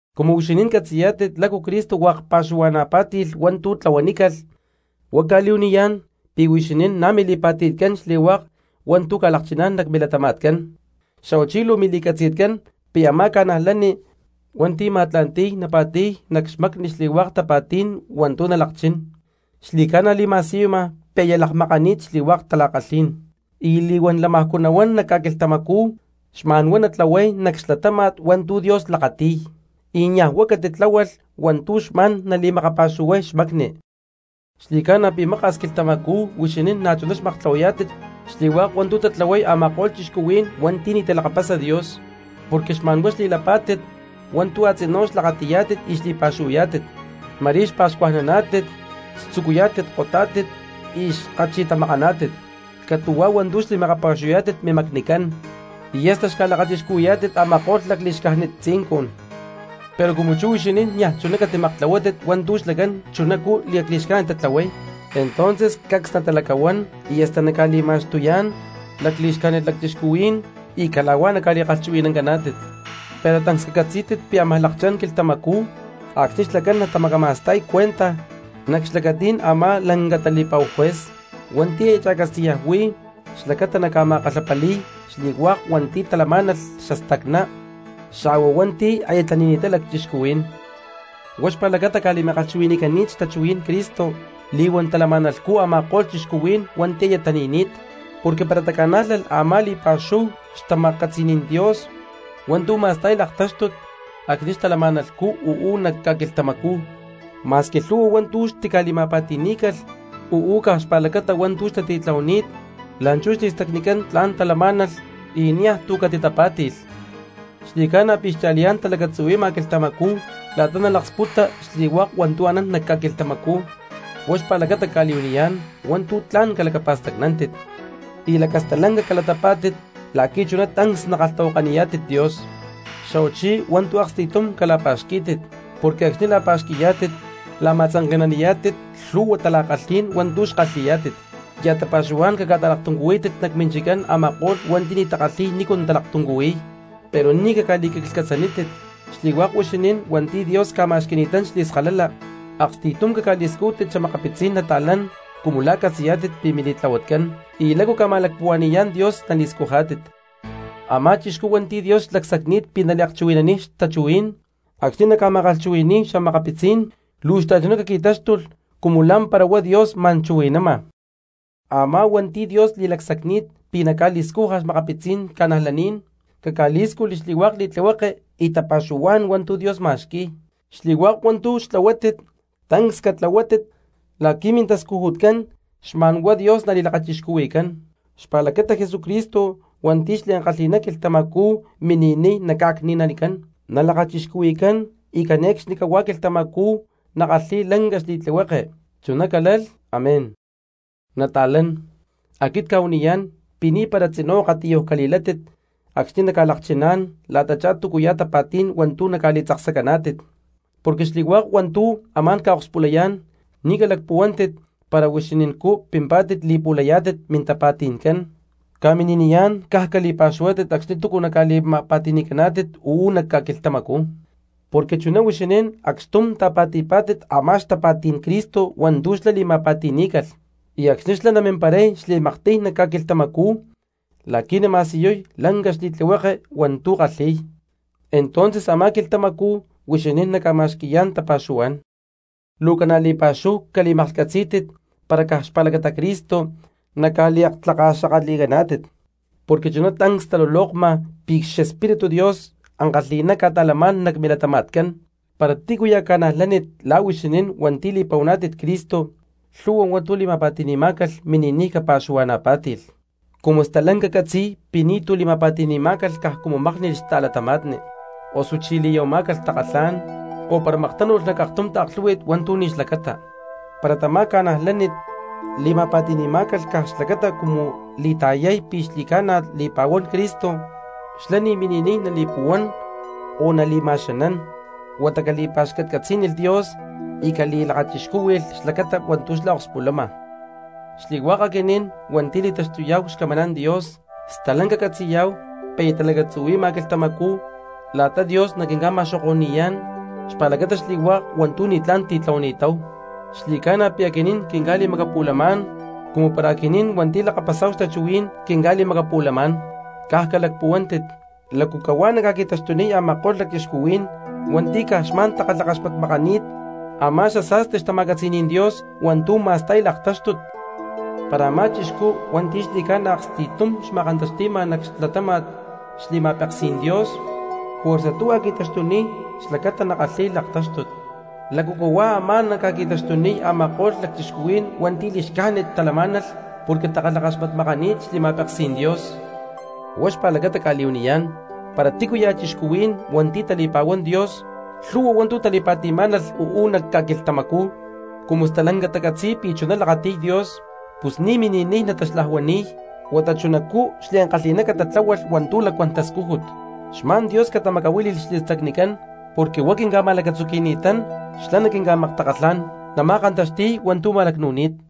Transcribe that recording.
Cumu huixinín catzi̠yá̠tit lácu Cristo hua̠k pa̠xuhua̠na̠ pá̠ti̠lh hua̠ntu̠ tlahuanícalh huá cca̠li̠huaniyá̠n pi̠ huixinín na̠ mili̠pa̠ti̠tcán xli̠hua̠k hua̠ntu̠ ca̠lakchiná̠n nac milatama̠tcán. Xa̠huachí luu mili̠catzi̠tcán pi̠ a̠má cristiano hua̠nti̠ ma̠tla̠nti̠y napa̠ti̠y nac xmacni xli̠hua̠k tapa̠tí̠n hua̠ntú nalakchín xli̠ca̠na li̠ma̠siyuma pi̠ aya lakmakani̠t xli̠hua̠k tala̠kalhí̠n, y li̠huán lamajcú nahuán nac ca̠quilhtamacú xma̠n huá natlahuay nac xlatáma̠t hua̠ntu̠ Dios lakati̠y y niaj huá catitláhualh hua̠ntu̠ xma̠n nali̠makapa̠xuhuay xmacni. Xli̠ca̠na pi̠ maka̠s quilhtamacú huixinín na̠chuná xmaktlahuayá̠tit xli̠hua̠k hua̠ntu̠ tatlahuay a̠ma̠ko̠lh cristianos hua̠nti̠ ni̠ talakapasa Dios, porque xma̠nhuá xli̠lapá̠tit hua̠ntú a̠tzinú xlakati̠yá̠tit y xli̠pa̠xuhuayá̠tit, ma̠rí xpa̠xcajnaná̠tit, xtzucuyá̠tit kotá̠tit y xkachi̠tamakaná̠tit, catu̠huá hua̠ntu̠ xli̠makapa̠xuhuayá̠tit mimacnicán, y hasta xca̠lakachixcuhui̠yá̠tit a̠ma̠ko̠lh lacli̠xcájnit tzincun. Pero cumu chú huixinín niaj chuná catimaktlahuátit hua̠ntú xlacán chunacú lacli̠xcájnit tatlahuay, entonces cacs natalacahuán y hasta naca̠li̠ma̠xtuyá̠n lacli̠xcájnit cristianos y cala̠huá naca̠li̠kalhchuhui̠nancaná̠tit. Pero tancs cacatzí̠tit pi̠ ámaj lakchá̠n quilhtamacú acxni̠ xlacán natamacama̠sta̠y cuentaj nac xlacatí̠n a̠má lanca tali̠pa̠hu juez hua̠nti̠ aya cha̠catzi̠yaj huí xlacata naca̠ma̠kalhapali̠y xli̠hua̠k hua̠nti̠ talamá̠nalh xastacná xa̠hua hua̠nti̠ aya tani̠ni̠ttá cristianos. Huá xpa̠lacata ca̠li̠ma̠kalhchuhui̠ni̠cani̠t xtachuhuí̠n Cristo li̠huán talama̠nalhcú a̠ma̠ko̠lh cristianos hua̠nti̠ aya tani̠ni̠t. Porque para taca̠nájlalh a̠má li̠pa̠xúhu xtama̠catzi̠ní̠n Dios hua̠ntu̠ ma̠sta̠y laktáxtut acxni̠ xtalama̠nalhcú uú nac ca̠quilhtamacú, ma̠squi lhu̠hua hua̠ntu̠ xtitali̠ma̠pa̠ti̠ní̠calh uú caj xpa̠lacata hua̠ntu̠ xtatitlahuani̠t, la̠nchú xli̠stacnicán tla̠n talamá̠nalh y niaj tu̠ catitapá̠ti̠lh. Xli̠ca̠na pi̠ xcha̠liyá̠n talacatzuhui̠ma quilhtamacú la̠ta nalaksputa xli̠hua̠k hua̠ntu̠ anán nac ca̠quilhtamacú, huá xpa̠lacata cca̠li̠huaniyá̠n hua̠ntu̠ tla̠n calacapa̠stacnántit y lacastalanca calatapá̠tit la̠qui̠ chuná tancs nakalhtahuakaniyá̠tit Dios. Xa̠huachí hua̠ntu̠ aksti̠tum cala̠pa̠xquí̠tit porque acxni̠ la̠pa̠xqui̠yá̠tit la̠ma̠tzanke̠naniyá̠tit lhu̠hua tala̠kalhí̠n hua̠ntu̠ kalhi̠yá̠tit. Ya̠ tapa̠xuhuá̠n caca̠ta̠laktuncuhuítit nac minchiccán a̠ma̠ko̠lh hua̠nti̠ ni̠ takalhi̠y nícu talaktuncuhuiy, pero ni̠ caca̠li̠quiclhcatzaniyá̠tit. Xli̠hua̠k huixinín hua̠nti̠ Dios ca̠ma̠xqui̠ni̠tán xli̠skalala, aksti̠tum caca̠li̠scújtit xa̠makapitzí̠n cristianos cumu la̠ catzi̠yá̠tit pi̠ mili̠tlahuatcán y lácu ca̠ma̠lacpuhua̠ni̠yá̠n Dios nali̠scujá̠tit. Amá cristiano hua̠nti̠ Dios li̠lacsacni̠t pi̠ naliakchuhui̠naniy xtachuhuí̠n, acxni̠ naca̠ma̠kalhchuhui̠ni̠y cristianos luu xta̠chuná caqui̠táxtulh cumu lá̠mpara huá Dios ma̠n chuhui̠nama. Amá hua̠nti̠ Dios li̠lacsacni̠t pi̠ naca̠li̠scuja xa̠makapitzí̠n cristianos, caca̠lí̠scujli xli̠hua̠k xli̠tlihueke y tapa̠xuhuá̠n hua̠ntu̠ Dios ma̠xqui̠y. Xli̠hua̠k hua̠ntu̠ xtlahuátit tancs catlahuátit la̠qui̠ mintascujutcán xma̠n huá Dios nali̠lakachixcuhui̠cán xpa̠lacata Jesucristo hua̠nti̠ xliankalhi̠ná quilhtamacú mini̠niy naca̠cni̠nanicán, nalakachixcuhui̠cán y cane̠cxnicahuá quilhtamacú nakalhi̠y lanca xli̠tlihueke. Chuná calalh amén. Nata̠lán, aquit cca̠huaniyá̠n pi̠ ni̠para tzinú akatiyuj cali̠látit acxni̠ naca̠lakchiná̠n la̠tachá túcuya̠ tapa̠tí̠n hua̠ntu̠ naca̠li̠tzaksacaná̠tit, porque xli̠hua̠k hua̠ntu̠ amá̠n ca̠akspulayá̠n ni̠ calacpuhuántit para huixinincú pimpá̠tit li̠pu̠layá̠tit mintapa̠ti̠ncán. Ca̠mini̠niyá̠n caj cali̠pa̠xuhuátit acxni̠ túcu ca̠li̠ma̠pa̠ti̠ni̠caná̠tit uú nac ca̠quilhtamacú, porque chuná huixinín acxtum ta̠pa̠ti̠pá̠tit a̠má xtapa̠tí̠n Cristo hua̠ntú xlá li̠ma̠pa̠ti̠ní̠calh, y acxni̠ xlá namimparay xli̠maktiy nac ca̠quilhtamacú la̠qui̠ nama̠siyuy lanca xli̠tlihueke hua̠ntú kalhi̠y, entonces a̠má quilhtamacú huixinín naca̠ma̠xqui̠yá̠n tapa̠xuhuá̠n. Luu ca̠na li̠pa̠xúhu cali̠maklhcatzí̠tit para caj xpa̠lacata Cristo naca̠liaktlakaxakatli̠caná̠tit, porque chuná tancs talulokma pi̠ xEspíritu Dios ankalhi̠ná ca̠ta̠lamá̠n nac milatama̠tcán. Para tícuya̠ cristiano la̠ huixinín hua̠nti̠ li̠pa̠huaná̠tit Cristo lhu̠hua hua̠ntu̠ li̠ma̠pa̠ti̠ni̠má̠calh mini̠niy capa̠xuhua̠na̠pá̠ti̠lh, cumu stalanca catzi̠y pi̠ ni̠tu̠ li̠ma̠pa̠ti̠ni̠má̠calh caj cumu mákni̠lh xta̠cristiano, osuchí li̠ya̠huamá̠calh takalhá̠n, o para maktánu̠lh nac aktum taaklhú̠hui̠t hua̠ntu̠ ni̠ xlacata. Para tamá cristiano li̠ma̠pa̠ti̠ni̠má̠calh caj xlacata cumu li̠ta̠yay pi̠ xli̠ca̠na li̠pa̠huán Cristo, xlá ni̠ mini̠niy nali̠puhuán o nali̠ma̠xanán, huata capa̠xcatcatzí̠nilh Dios y cali̠lakachixcúhui̠lh xpa̠lacata hua̠ntu̠ akspulama. Xli̠hua̠k aquinín hua̠nti̠ li̠taxtuyá̠hu xcamaná̠n Dios stalanca catzi̠yá̠hu pi̠ aya talacatzuhui̠ma quilhtamacú la̠ta Dios naquinca̠ma̠xoko̠ni̠yá̠n xpa̠lacata xli̠hua̠k hua̠ntu̠ ni̠tlá̠n titlahuani̠táhu, xli̠ca̠na pi̠ aquinín quinca̠li̠macapu̠lamá̠n, cumu para aquinín hua̠nti̠ lakapasá̠hu xtachuhuí̠n quinca̠li̠macapu̠lamá̠n, caj calacpuhuántit, ¿lácu cahuá naca̠qui̠taxtuniy a̠ma̠ko̠lh cristianos hua̠nti̠ caj xma̠n takalhakaxmatmakani̠t amá xasa̠sti xtama̠catzi̠ní̠n Dios hua̠ntú ma̠sta̠y laktáxtut? Para a̠má cristiano hua̠nti̠ xli̠ca̠na aksti̠tum xma̠kantaxti̠ma nac xlatáma̠t xli̠ma̠peksí̠n Dios, juerza tuhua qui̠taxtuniy xlacata nakalhi̠y laktáxtut, ¿lácu cahuá ámaj ca̠qui̠taxtuniy a̠ma̠ko̠lh cristianos hua̠nti̠ li̠xcájnit talamá̠nalh porque takalhakaxmatmakani̠t xli̠ma̠peksí̠n Dios? Huá xpa̠lacata cca̠li̠huaniyá̠n, para tícuya̠ cristianos hua̠nti̠ tali̠pa̠huán Dios lhu̠hua hua̠ntu̠ tali̠pa̠ti̠má̠nalh uú nac ca̠quilhtamacú cumu stalanca tacatzi̠y pi̠ chuná lakati̠y Dios, pus ni̠ mini̠niy nataxlajuani̠y, huata chunacú xliankalhi̠ná catatláhualh hua̠ntu̠ lacuán tascújut, xma̠n Dios catamacahuíli̠lh xli̠stacnicán, porque huá quinca̠ma̠lacatzuqui̠ni̠tán xlá naquinca̠maktakalhá̠n, nama̠kantaxti̠y hua̠ntu̠ ma̠lacnu̠ni̠t.